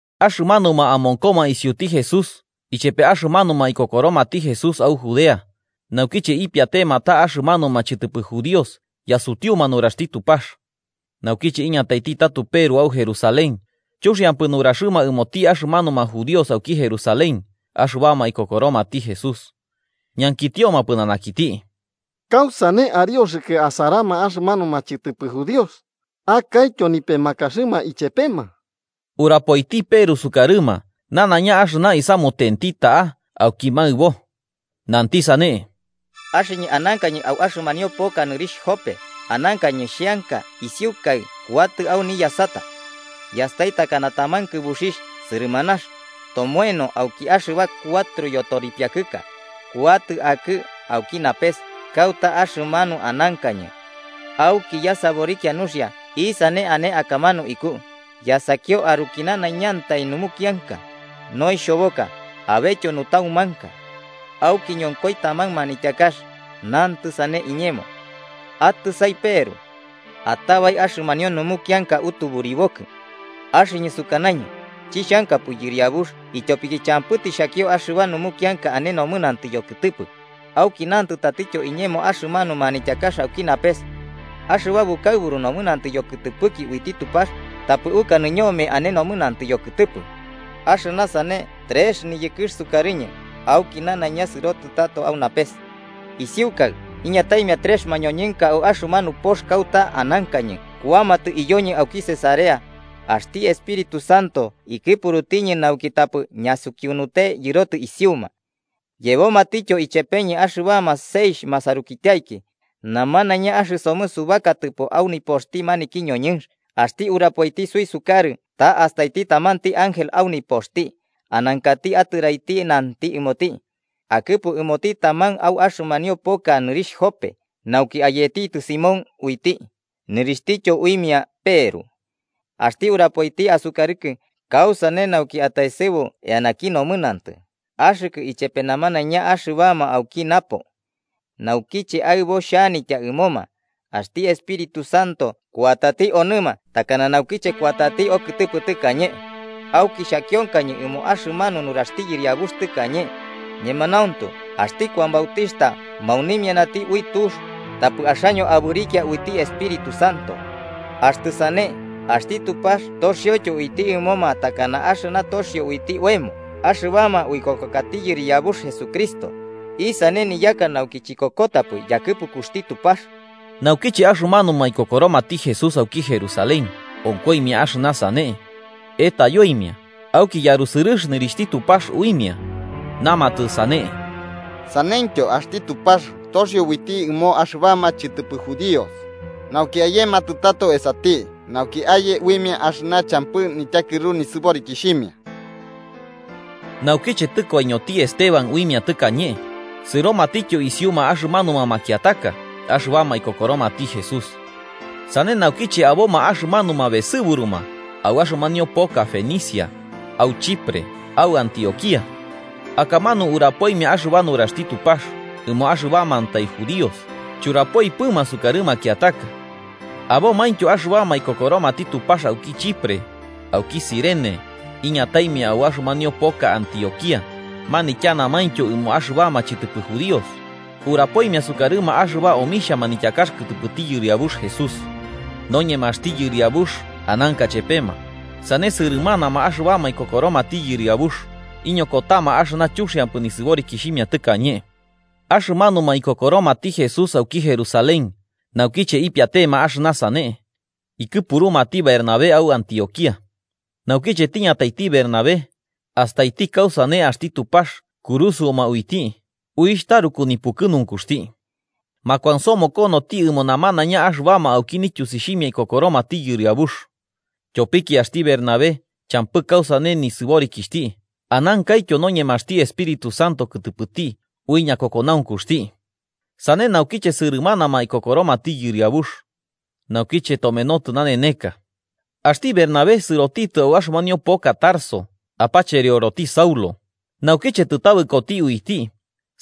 Axɨmanuma amonkoma isiuti Jesús ichepe axɨmanuma ikokoromati Jesús au Judea, naukiche ipiatema ta axɨmanuma chɨtɨpɨ judíos yasutiuma nuraxti Tupax. Naukiche iñataiti tato Peru au Jerusalén, chuxiampɨ nuraxɨma ɨmoti axɨmanuma judíos auki Jerusalén axɨbama ikokoromati Jesús. Ñankitioma pɨnanakiti: –¿Kausane arioxɨkɨ asarama axɨmanuma chɨtɨpɨ judíos, akaityo nipemakaxɨma ichepema? Urapoiti Peru sukarɨma nanaiña axɨna isamutenti ta'a auki maɨbo. Nanti sane: 5–Axɨñɨ anankañɨ au axɨmanio poka nɨrixh Jope, anankañɨ xheanka isiukai kuatɨ au niyasata: Yastai takana taman kɨbuxixh sɨrɨmanax, tomoeno auki axɨba cuatro yotoripiakɨka, kuatɨ akɨ auki napes kauta axɨmanu anankañɨ. Auki yasaborikia nuxia isane ane akamanu ikuu, yasakio aruki nanaiñantai numukianka, noixhoboka, abetyo nutaumanka. Auki ñonkoi taman manityakax, nantɨ sane iñemo: ‘Atɨsai Peru. Atabai axɨmanio numukianka atuburibokɨ.’ Axɨñɨ sukanañɨ: ‘Chixhankapɨ Yɨriabux, ityopiki champɨ tixhakio axɨba numukianka ane nomɨnantɨ yokɨtɨpɨ.’ Auki nantɨ tatityo iñemo axɨmanu manityakax auki napes: ‘Axɨba bukaɨburu nomɨnantɨ yokɨtɨpɨki uiti Tupax tapɨ ukanɨ ñome ane nomɨnantɨ yokɨtɨpɨ.’ Axɨna sane trex niyɨkɨx sukarɨñɨ, auki nanaiña sɨrotɨ tato au napes. Isiukaɨ, iñataimia trex mañoñɨnka au axɨmanu pox kauta anankañɨ kuamatɨ iyoñɨ auki Cesarea. Axti Espíritu Santo ikɨpurutiñɨ nauki tapɨ ñasukiunute yɨrotɨ isiuma. Yebomatityo ichepeñɨ axɨbama seixh masarukityaiki. Namanaiña axɨsomɨ subakatɨpo au nipoxti maniki ñoñɨnx, axti urapoiti suisukarɨ ta astaiti tamanti ángel au nipoxti, anankati atɨraiti nanti ɨmoti: ‘Akɨpu ɨmoti taman au axɨmanio poka nɨrixh Jope nauki ayetitɨ Simón uiti, nɨrixhtityo uimia Peru. Axti urapoiti asukarɨkɨ kausane nauki ataesɨbu eanaki nomɨnantɨ, axɨkɨ ichepe namanaiña axɨbama auki napo.’ Naukiche aɨbo xhanitya ɨmoma, axti Espíritu Santo kuatati onɨma takana naukiche kuatati okɨtɨpɨ tɨkañe. Auki xhakionkañɨ ɨmo axɨmanu nuraxti Yɨriabux tɨkañe: ‘Ñemanauntu axti Kuan Bautixhta maunimianati ui tux, tapɨ axaño abɨrikia uiti Espíritu Santo.’ Axtɨ sane, axti Tupax toxioityo uiti ɨmoma takana axɨna toxio uiti oemo axɨbama uikokokati Yɨriabux Jesucristo, ¿isane niyaka nauki chikokotapɨ yakɨpukuxti Tupax? Naukiche axɨmanuma ikokoromati Jesús auki Jerusalén onkoimia axɨna sane, etayoimia auki yarusɨrɨx nɨrixhti Tupax uimia, namatɨ sane: –¡Saneityo axti Tupax toxio uiti ɨmo axɨbama chɨtɨpɨ judíos, nauki ayematɨ tato esati nauki aye uimia axɨna champɨ nityakɨru nisɨborikixhimia! Naukiche tɨkoiñoti Esteban uimia tɨkañe, sɨromatityo isiuma axɨmanuma makiataka axɨbama ikokoromati Jesús. Sane naukiche aboma axɨmanuma besɨburuma au axɨmanio poka Fenicia au Chipre au Antioquía. Akamanu urapoimia axɨba nuraxti Tupax ɨmo axɨbamantai judíos, churapoipɨma sukarɨ makiataka. Abomaintyo axɨbama ikokoromati Tupax auki Chipre, auki Cirene, iñataimia au axɨmanio poka Antioquía manityanamaintyo ɨmo axɨbama chɨtɨpɨ judíos, urapoimia sukarɨma axɨba omixha manityakax kɨtɨpɨti Yɨriabux Jesús. Noñemaxti Yɨriabux ananka chepema, sane sɨrɨmanama axɨbama ikokoromati Yɨriabux, iñokotama axɨna chuxiampɨ nisɨborikixhimia tɨkañe. Axɨmanuma ikokoromati Jesús auki Jerusalén, naukiche ipiatema axɨna sane. Ikɨpurumati Bernabé au Antioquía. Naukiche tiñataiti Bernabé, astaiti kausane axti Tupax kurusɨoma uiti, uixh taruku nipukɨnunkuxti. Makuansomokonoti ɨmo namanaiña axɨbama auki nityusixhimia ikokoromati Yɨriabux. Tyopiki axti Bernabé champɨ kausane nisɨborikixhti anankaityo noñemaxti Espíritu Santo kɨtɨpɨti ui ñakokonaunkuxti. Sane naukiche sɨrɨmanama ikokoromati Yɨriabux. Naukiche tomenotɨ naneneka. Axti Bernabé sɨrotitɨ au axɨmanio poka Tarso apacherioroti Saulo, naukiche tɨtabɨkoti uiti,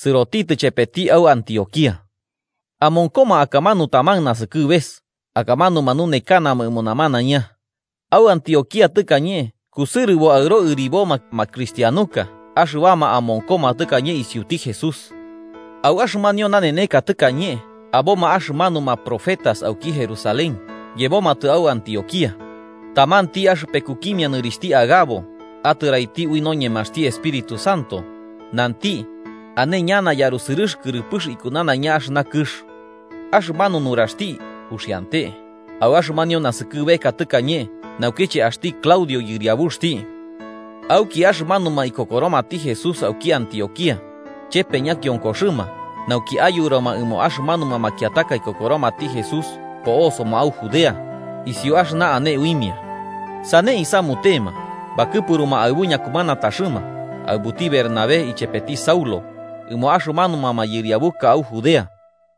sɨrotitɨ chepeti au Antioquía. Amonkoma akamanu taman nasɨkɨbeka, akamanu manunekanama ɨmo namanaiña. Au Antioquía tɨkañe kusɨrɨbo aɨro ɨriboma makrixhtianuka axɨbama amonkoma tɨkañe isiuti Jesús. Au axɨmanio naneneka tɨkañe aboma axɨmanuma profetas auki Jerusalén yebomatɨ au Antioquía. Tamanti axɨpekukimia nɨrixhti Agabo, atɨraiti ui noñemaxti Espíritu Santo, nanti, ane ñana yarusɨrɨx kɨrɨpɨx iku nanaiña axɨna kɨx. Axɨmanu nuraxti uxiante, au axɨmanio naskɨbeka tɨkañe naukiche axti Claudio yɨriabuxti. Auki axɨmanuma ikokoromati Jesús auki Antioquía, chepe ñakionkoxɨma nauki ayurama ɨmo axɨmanuma makiataka ikokoromati Jesús po'osoma au Judea, isiu axɨna ane uimia. Sane isamutema, bakɨpuruma aɨbu ñakumanataxɨma aɨbuti Bernabé ichepeti Saulo, ɨmo axɨmanuma mayɨriabuka au Judea.